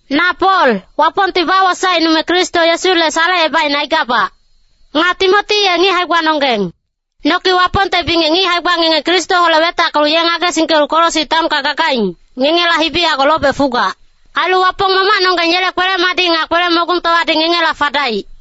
Na Pol, Wapongti bawosaecnume Kristo Yesule salecebaicne aigabac. Nga Timoti ye ngic hae-gbanonggeng. Noki Wapongte bingec ngic hae-gba ngenge Kristoholec wetackelu ye ngagesingkelu Kolosi taonka gagaing, ngengela hibi yago lobec fugac. Ailu Wapong Mamacnonggeng yele kwele-madic nga kwele-mogungtowadi ngengela fadaic.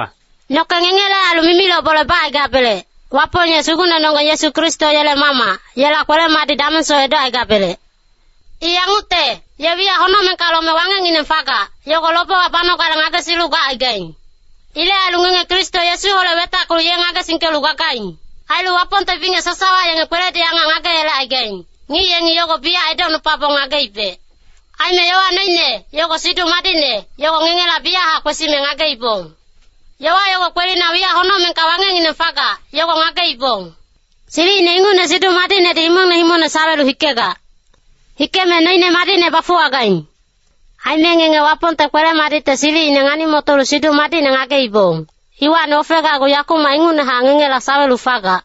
Noke ngengele ailu mimiloc bole bacaigabelec, Wapong ye Sugucnenonggeng Yesu Kristo yele Mamac, yela kwele-madic damengsoc edocaigabelec. I yangucte, ye wiyac honocmengka lome wangecngineng fagac, yogo lobewa banogale ngagesilu gacaigaing. Ilec ailu ngenge Kristo Yesuholec wetackelu ye ngagesingkelu gagaing. Ailu Wapongte bingec sasawa yenge kweledi angac ngageyelecaigaing, ngic yengi yogo biyachac edocnupabong ngageibec. Aime yowa noine, yogo Siduc Madicne, yogo ngengela biyachac kwesime ngageibong. Yowa yogo kwelina wiyac honocmengka wangecngineng fagac, yogo ngageibong. Silicine ingucne Siduc Madicnedi himongne himongne sawelu hikegac. Hikeme noine madicne bafuwagaing. Aime ngenge Wapongte kwele-madicte silicine ngani-motolu Siduc Madicne ngageibong, iwacni ofegacgu yakumac ingucnehac ngengela sawelu fagac.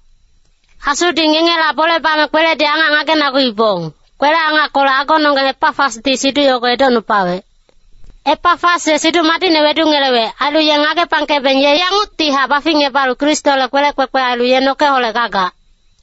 Asudi ngengela bole bame kweledi angac ngagenaguibong, kwele-angackolec agononggeng Epafasdi siduc yogo edocnupawec. Epafas ye Siduc Madicne wedungelewec, ailu ye ngagepangkebeng ye yanguctihac baficngebalu Kristole kwelec kwekwe ailu ye nokeholec gagac.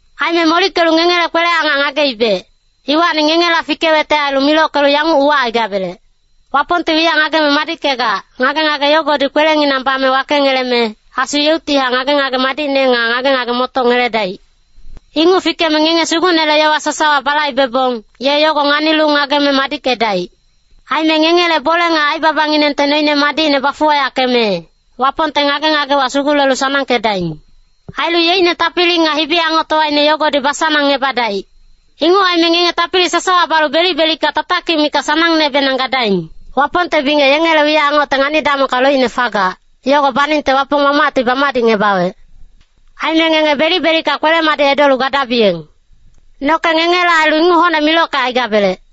Aime molickelu ngengele kwele-angac ngageibec, iwacni ngengela fikewecte ailu milockelu yanguc uwacaigabelec. Wapongti wiyac ngageme madickegac, ngage-ngage yogodi kwelenginang bame wakengeleme, Asu yeuctihac ngage-ngage madicne nga ngage-ngage-motoc ngeledaic. Inguc fikeme ngenge Sugucnele yowa sasawa balaibebong, ye yogo nganilu ngageme madickedaic. Aime ngengele bole nga aibabanginengte noine madicne bafuwayackeme, Wapongte ngage-ngagewa sugulelu sanangkedaing. Ailu yeicne tapili nga hibi-angoctowaine yogodi basanangngebadaic. Inguc aime ngenge tapili sasawa balu belic-belicka tatakic mikac sanangnebenang gadaing. Wapongte bingec yengele wiyac angocte ngani-damongka loicne fagac, yogo baningte Wapong Mamacti bamadicngebawec. Aime ngenge belic-belicka kwele-madic edolu gadabiyeng. Noke ngengele ailu inguc hocne milockecaigabelec.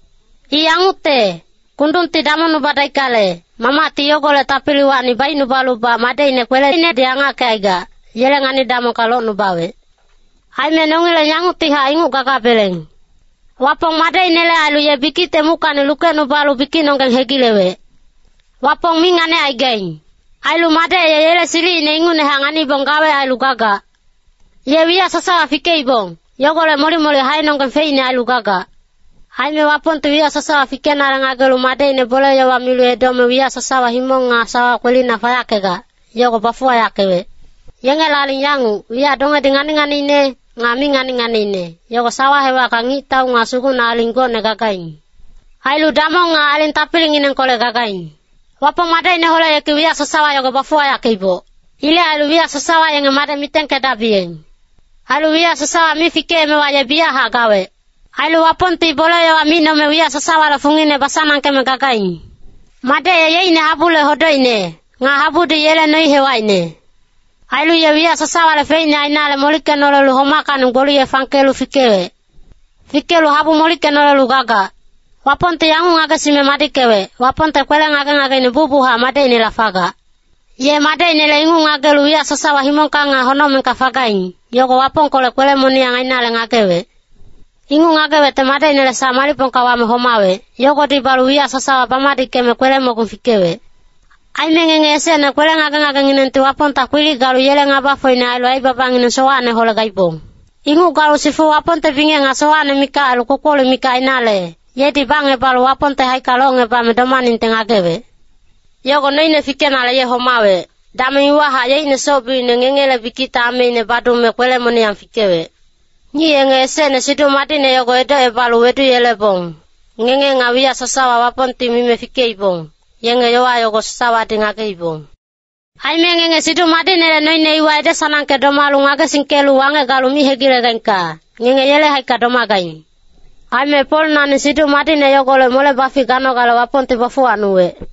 I yangucte, kundungti damongnubadaickale, Mamacti yogolec tapiliwacni baicnubalubac Madecine kweleinedi angackecaigac, yele ngani-damongka locnubawec. Aime nongileng yanguctihac inguc gagabeleng. Wapong Madecinele ailu ye bikicte muckacni lukecnubalu bikicnonggeng hegilewec. Wapong mi nganicaigaing. Ailu Madec ye yele silicine ingucnehac nganibong gawec ailu gagac. Ye wiyac sasawa fikeibong, yogolec molic-molic haenonggeng feicne ailu gagac. Aime Wapongti wiyac sasawa fikenale ngagelu Madecine bole-yowa milu edome wiyac sasawa himong nga sawa kwelina fayackegac, yogo bafuwayackewec. Yengele aling yanguc, wiyac dongedi ngani-nganiine, nga mi ngani-nganiine, yogo sawa hewacka ngictau nga sugucne-aling gocne gagaing. Ailu damong nga aling tapilinginengkolec gagaing. Wapong Madecineholec yeki wiyac sasawa yogo bafuwayackeiboc. Ilec ailu wiyac sasawa yenge Madec mitengkedabiyeng. Ailu wiyac sasawa mi fikeemewa ye biyachac gawec. Ailu Wapongti bole-yowa micnome wiyac sasawale fungine basanangkeme gagaing. Madec ye yeicne habule hodocine, nga habudi yele noi-hewacine. Ailu ye wiyac sasawale feicne ainale molickenolelu homackacni gboliye fangkelu fikewec. Fikelu habu molickenolelu gagac. Wapongti yanguc ngagesime madickewec, Wapongte kwele ngage-ngageine bucbuchac Madecinela fagac. Ye Madecinele inguc ngagelu wiyac sasawa himongka nga honocmengka fagaing, yogo Wapongkolec kwele-moniyang ainale ngagewec. Inguc ngagewecte Madecinele sac malicpongka wame homawec, yogodi balu wiyac sasawa bamadickeme kwele-mogung fikewec. Aime ngenge esecne kwele ngage-ngagenginengti Wapongta kwilic galu yele ngabafocine ailu aibabangineng sowacneholec gaibong. Inguc galu sifu Wapongte bingec nga sowacne mikac ailu kpokpolic mikac ainale, yedi bacngebalu Wapongte haicka locngebame domaningte ngagewec. Yogo noine fikenale ye homawec, dameng iwahac yeicne soc-biucine ngengele bikicte ameine badume kwele-moniyang fikewec. Ngic yenge esecne Siduc Madicne yogo edocebalu weduyelebong, ngenge nga wiyac sasawa Wapongti mime fikeibong, yenge yowa yogo sasawadi ngageibong. Aime ngenge Siduc Madicnele noine iwa ede-sanangke domalu ngagesingkelu wangec galu mi hegilegaingka, ngenge yele haicka domagaing. Aime Pol nani Siduc Madicne yogolec mole-bafic ganogale Wapongti bafuwacnuwec.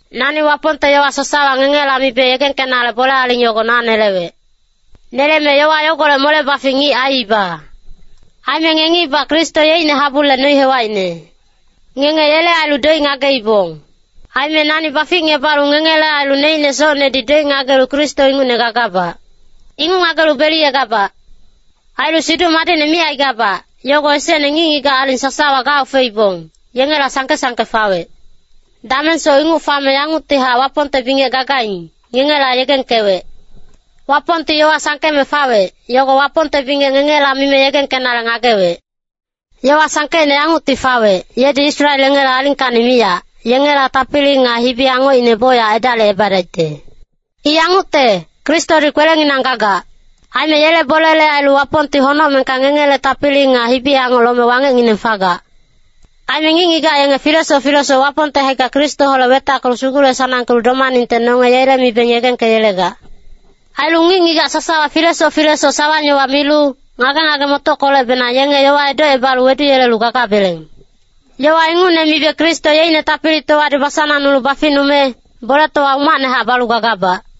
Nani Wapongte yowa sasawa ngengela mibe yegengkenale bole aling yogo na nelewec. Neleme yowa yogolec mole-bafic ngic aiiba. Aime ngengibac Kristo yeicne habule noi-hewacine. Ngenge yele ailu doic ngageibong. Aime nani baficngebalu ngengele ailu neicne socnedi doic ngagelu Kristo ingucne gagabac. Inguc ngagelu beliyegabac. Ailu Siduc Madicne micaigabac, yogo esecne ngic-ngigac aling sasawa gaofeibong, yengela sangke-sangke fawec. Damengsoc inguc fame yanguctihac Wapongte bingec gagaing, ngengela yegengkewec. Wapongti yowa sangkeme fawec, yogo Wapongte bingec ngengela mime yegengkenale ngagewec. Yowa sangkeicne yangucti fawec, yedi Israel yengele alingkacni miyac, yengela tapili nga hibi-angocine bocyac edalicebadaicte. I yangucte, Kristodi kwelenginang gagac. Aime yele bolele ailu Wapongti honocmengka ngengele tapili nga hibi-angoc lome wangecngineng fagac. Aime ngic-ngigac yenge filesoc filesoc Wapongte haicka Kristoholec wetackelu sugule-sanangkelu domaningte nonge yele mibeng yegengkeyelegac. Ailu ngic-ngigac sasawa filesoc filesoc sawang-yowa milu, ngage-ngage-motockolecbenang yenge yowa edocebalu weduyelelu gagabeleng. Yowa ingucne mibe Kristo yeicne tapilitowadi basanangnulu baficnume, boletowa umacnehac balu gagabac.